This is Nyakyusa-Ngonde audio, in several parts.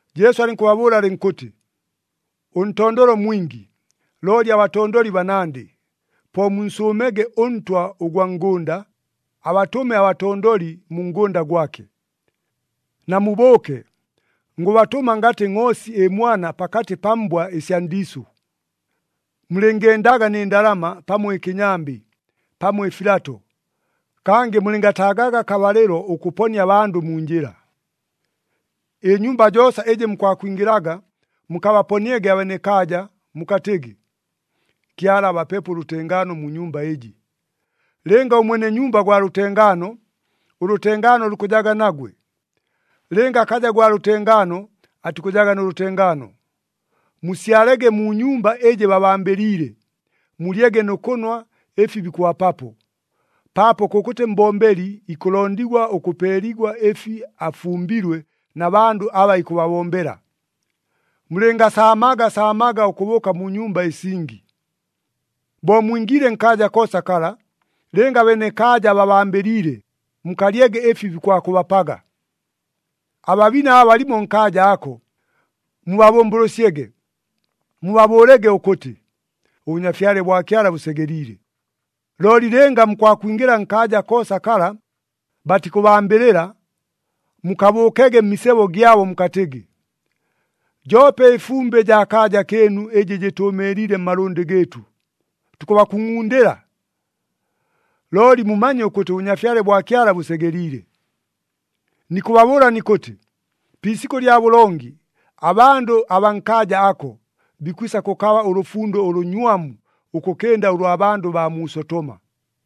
Jesu alɨnkʉbabʉʉla alɨnkʉtɨ, “Ʉntondolo mwingi, looli abatondoli banandɨ. Po munsʉʉmege ʉNtwa ʉgwa ngʉnda, abatʉme abatondoli mu ngʉnda gwake. Namubʉʉke, ngʉbatʉma ngatɨ ngʼoosi ɨmwana pakatɨ pa mbwa ɨsya ndiisʉ! Mulɨngendaga nɨ ndalama, pamo ɨkɨnyambɨ, pamo ɨfilato. Kangɨ mulɨngataagaga akabalɨlo ʉkʉponia abandʉ mu njɨla. “Ɨnyumba joosa ɨjɨ mukwakwingɨlaga mukabaponiege abenekaaja, mukatɨgɨ, ‘Kyala abapepo ʉlʉtengaano mu nyumba ɨjɨ.’ Lɨnga ʉmwene nyumba gwa lʉtengaano, ʉlʉtengaano lukʉjaga nagwe. Lɨnga akaja gwa lʉtengaano, atikʉjaga nʉ lʉtengaano. Musyalege mu nyumba ɨjɨ babambɨliile, mulyege nʉ kʉnwa ɨfi bikʉbapapo. Paapo kʉkʉtɨ mbombeli ikʉlondigwa ʉkʉpeeligwa ɨfi afumbilwe na bandʉ aba ikʉbabombela. Mulɨngasaamaga saamaga ʉkʉbʉʉka mu nyumba ɨsingi. “Bo mwingiile nkaaja koosa kala, lɨnga abenekaaja babambɨliile, mukalyege ɨfi bikwakʉbapaga. Ababine aba balimo nkaaja ako, mubabʉmbʉlʉsyege. Mubabʉʉlege ʉkʉtɨ, ‘ɄBʉnyafyale bwa Kyala bʉsegeliile.’ Looli lɨnga mukwakwingɨla nkaaja koosa kala, batikʉbambɨlɨla, mukabʉʉkege mmisebo gyabo mukatɨgɨ, ‘Joope ɨfumbɨ jaa kaaja kɨɨnu ɨjɨ jɨtʉʉmɨɨliile mmalʉndɨ gɨɨtʉ, tukʉbakungʼundɨla. Looli mumanye ʉkʉtɨ ʉBʉnyafyale bwa Kyala bʉsegeliile.’ Nikʉbabʉʉla nikʉtɨ, pi isikʉ lya bʉlongi, abandʉ abaa nkaaja ako, bikwisa kʉkaba ʉlʉfundo ʉlʉnywamu, ʉkʉkɨnda ʉlwa bandʉ baa mu Sotoma!”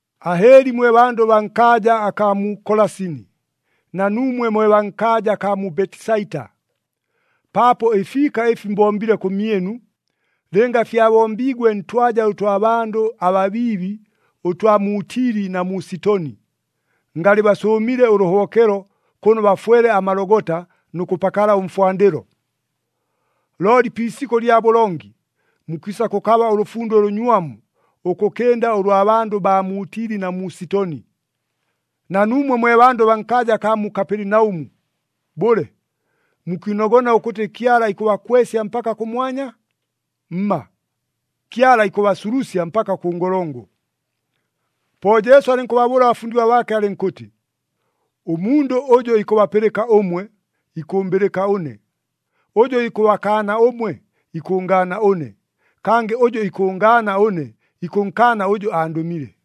“Ahɨɨli mwe bandʉ baa nkaaja akaa mu Kolasini, na nuumwe mwe baa nkaaja akaa mu Betisaita! Paapo ɨfiika ɨfi mbombile kʉmyɨnu, lɨnga fyabombiigwe ntwaja ʉtwa bandʉ ababiibi ʉtwa mu Tili na mu Sitoni, ngalɨ basʉʉmile ʉlʉhobokelo kʉno bafwele amalogota nʉ kʉpakala ʉmfwandɨlo. Looli pi isikʉ lya bʉlongi, mukwisa kʉkaba ʉlʉfundo ʉlʉnywamu, ʉkʉkɨnda ʉlwa bandʉ baa mu Tili na mu Sitoni! Na nuumwe mwe bandʉ baa nkaaja akaa mu Kapelinaʉmu, bʉle, mukwinogona ʉkʉtɨ Kyala ikʉbakwesya mpaka kʉmwanya? Mma! Kyala ikʉbasulusya mpaka kʉ ngolongo.” Po Jesu alɨnkʉbabʉʉla abafundigwa baake alɨnkʉtɨ, “Ʉmundʉ ʉjʉ ikʉbapɨlɨka ʉmwe, ikʉmbɨlɨka ʉne. Ʉjʉ ikʉbakaana ʉmwe, ikʉngaana ʉne. Kangɨ ʉjʉ ikʉngaana ʉne, ikʉnkaana ʉjʉ andʉmile.”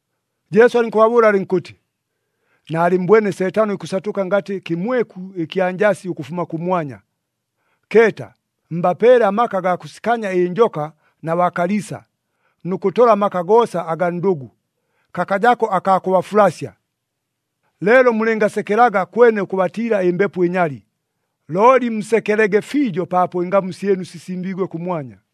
Jesu alɨnkʉbabʉʉla alɨnkʉtɨ, “Naalɨmmbwene Seetano ikʉsatʉka ngatɨ kɨmweku ɨkya njasi ʉkʉfuma kʉmwanya. Keeta! Mbapeele amaka agaa kʉsikanya ɨnjoka na baa kaliisa, nʉ kʉtola amaka goosa agaa ndʉgʉ. Kakajako akaa kʉbafulasya. Leelo mulɨngasekelaga kwene ʉkʉbatiila ɨmbepo ɨnyali, looli musekelege fiijo paapo ɨngamu syɨnu sisimbiigwe kʉmwanya.”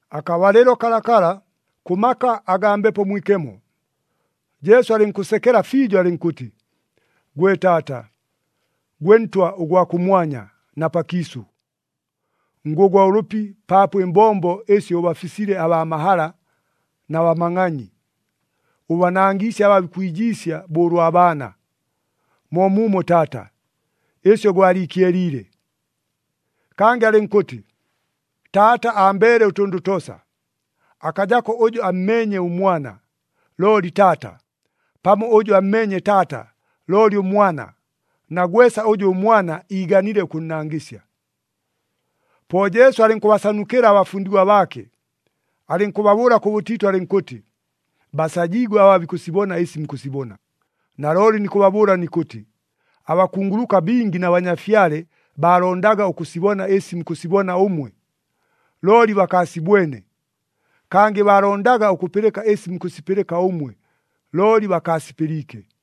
Akabalɨlo kalakala, kʉ maka agaa Mbepo Mwikemo, Jesu alɨnkʉsekela fiijo alɨnkʉtɨ, “Gwe Taata, gwe Ntwa ʉgwa kʉmwanya na pakiisʉ, ngʉgwa ʉlʉpi paapo ɨmbombo ɨsyo ʉbafisile abaa mahala na bamangʼanyi, ʉbanangiisye aba bikwijiisya bo ʉlwa baana. Moomuumo Taata, ɨsyo gwaliikyeliile.” Kangɨ alɨnkʉtɨ, “Taata ambeele ʉtʉndʉ toosa. Akajako ʉjʉ ammeenye ʉMwana, looli Taata, pamo ʉjʉ ammeenye Taata looli ʉMwana, na gwesa ʉjʉ ʉMwana iiganile ʉkʉnnangɨsya.” Po Jesu alɨnkʉbasanukɨla abafundigwa baake, alɨnkʉbabʉʉla kʉbʉtiitʉ alɨnkʉtɨ, “Basajiigwe aba bikʉsibona ɨsi mukʉsibona! Nalooli nikʉbabʉʉla nikʉtɨ, abakunguluka bingi na banyafyale baalondaga ʉkʉsibona ɨsi mukʉsibona ʉmwe, looli bakaasibwene. Kangɨ baalondaga ʉkʉpɨlɨka ɨsi mukʉsipɨlɨka ʉmwe, looli bakaasipɨliike.”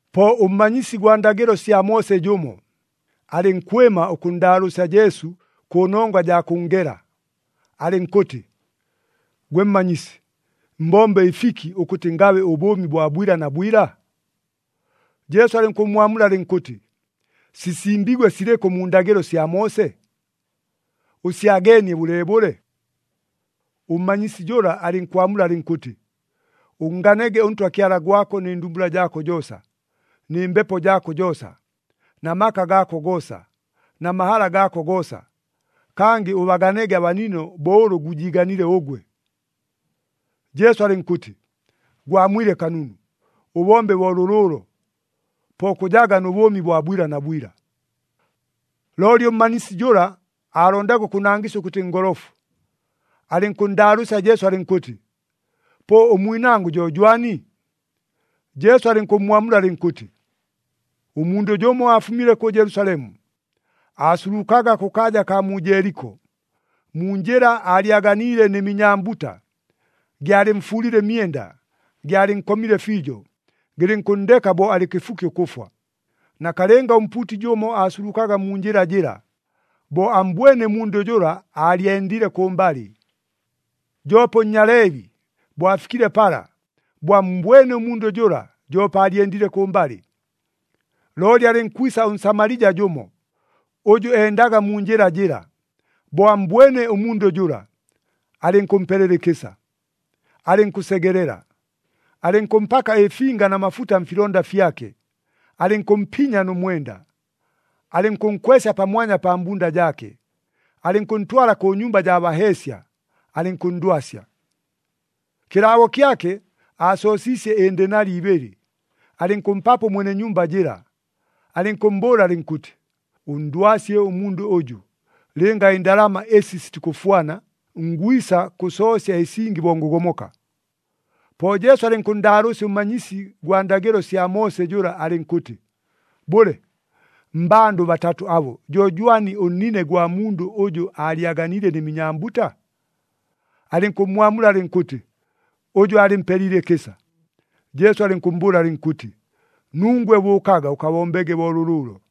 Po ʉmmanyisi gwa ndagɨlo sya Moose jʉmo, alɨnkwɨma ʉkʉnndaalʉʉsya Jesu kʉnongwa jaa kʉnngela, alɨnkʉtɨ, “Gwe Mmanyisi, mbombe ɨfiki, ʉkʉtɨ ngabe ʉbʉʉmi bwa bwila na bwila?” Jesu alɨnkʉmmwamula alɨnkʉtɨ, “Sisimbiigwe silɨkʉ mu ndagɨlo sya Moose? Ʉsyageenie bʉleebʉle?” Ʉmmanyisi jʉla alɨnkwamula alɨnkʉtɨ, “Ʉnnganege ʉNtwa Kyala gwako nɨ ndumbula jaako joosa, nɨ mbepo jaako joosa, na maka gaako goosa, na mahala gaako goosa, kangɨ ʉbaganege abanino bo ʉlʉ gwijiiganile ʉgwe.” Jesu alɨnkʉtɨ, “Gwamwile kanunu! Ʉbombe bo lʉlʉʉlo, po kʉjaga nʉ bʉʉmi bwa bwila na bwila.” Looli ʉmmanyisi jʉla, aalondaga ʉkʉnangɨsya ʉkʉtɨ ngolofu, alɨnkʉnndaalʉʉsya Jesu alɨnkʉtɨ, “Po ʉmwinangʉ jo jwani?” Jesu alɨnkʉmmwamula alɨnkʉtɨ, “Ʉmundʉ jʉmo aafumile kʉ Jelusalemu, aasulukaga kʉkaaja kaa mu Jeeliko. Mu njɨla aalyaganiile nɨ minyambuta, gyalɨmfuulile ɨmyenda, gyalɨnkomile fiijo, gɨlɨnkʉnndeka bo alɨ kɨfuki ʉkʉfwa. Nakalɨnga ʉmpuuti jʉmo aasulukaga mu njɨla jɨla. Bo ammbwene ʉmundʉ jʉla aalyendile kʉmbalɨ. Joope ʉNnyaleebi, bo afikile pala, bo ammbwene ʉmundʉ jʉla, joope aalyendile kʉmbalɨ. Looli alɨnkwisa ʉNsamalija jʉmo, ʉjʉ endaga mu njɨla jɨla. Bo ammbwene ʉmundʉ jʉla, alɨnkʉmpelela ɨkɨsa, alɨnkʉsegelela, alɨnkʉmpaka ɨfinga na mafuta mfilonda fyake, alɨnkʉmpinya nʉ mwenda. Alɨnkʉnkwesya pamwanya pa mbunda jaake, alɨnkʉntwala kʉ nyumba jaa baheesya, alɨnkʉnndwasya. “Kɨlaabo kyake, aasoosiisye ɨndenali ibɨlɨ, alɨnkʉmpapo ʉmwene nyumba jɨla, alɨnkʉmmbʉʉla alɨnkʉtɨ, ‘Ʉnndwasye ʉmundʉ ʉjʉ. Lɨnga ɨndalama ɨsi sitikʉfwana, ngwisa kʉsoosya ɨsingi bo ngʉgomoka.’” Po Jesu alɨnkʉnndaalʉʉsya ʉmmanyisi gwa ndagɨlo sya Moose jʉla alɨnkʉtɨ, “Bʉle, mmbandʉ batatʉ abo, jo jwani ʉnnine ʉgwa mundʉ ʉjʉ aalyaganiile nɨ minyambuta?” Alɨnkʉmmwamula alɨnkʉtɨ, “Ʉjʉ aalɨmpeliile ɨkɨsa.” Jesu alɨnkʉmmbʉʉla alɨnkʉtɨ, “Nungwe bʉʉkaga ʉkabombege bo lʉlʉʉlo!”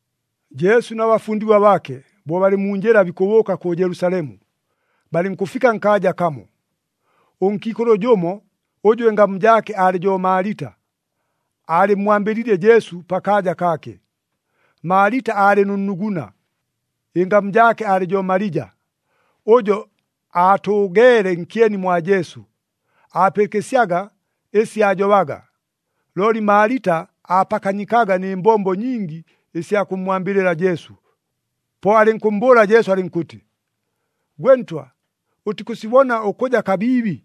Jesu na bafundigwa baake, bo balɨ mu njɨla bikʉbʉʉka kʉ Jelusalemu, balɨnkʉfika nkaaja kamo. Ʉnkiikʉlʉ jʉmo, ʉjʉ ɨngamu jaake aalɨ jo Maalita, aalɨmmwambɨliile Jesu pakaaja kaake. Maalita aalɨ nʉ nnuguna, ɨngamu jaake aalɨ jo Malija. Ʉjo aatʉʉgeele nkyeni mwa Jesu, aapɨlɨkɨsyaga ɨsi aajobaga. Looli Maalita aapakanyikaga nɨ mbombo nyingi ɨsya kʉmmwambɨlɨla Jesu. Po alɨnkʉmmbʉʉla Jesu alɨnkʉtɨ, “Gwe Ntwa, ʉtikʉsibona ʉkʉja kabiibi,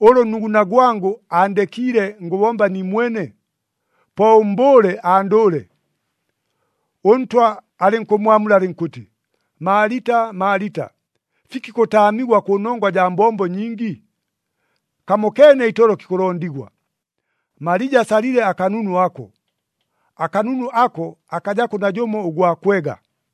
ʉlʉ ʉnnuguna gwangʉ aandekiile ngʉbomba niimwene? Po ʉmmbʉʉle andʉʉle!” ɄNtwa alɨnkʉmmwamula alɨnkʉtɨ, “Maalita, Maalita! Fiki kʉtaamigwa kʉnongwa jaa mbombo nyingi? Kamokeene itolo kikʉlondigwa. Malija asalile akanunu ako, akanunu ako akajako najʉmo ʉgwa kwega.”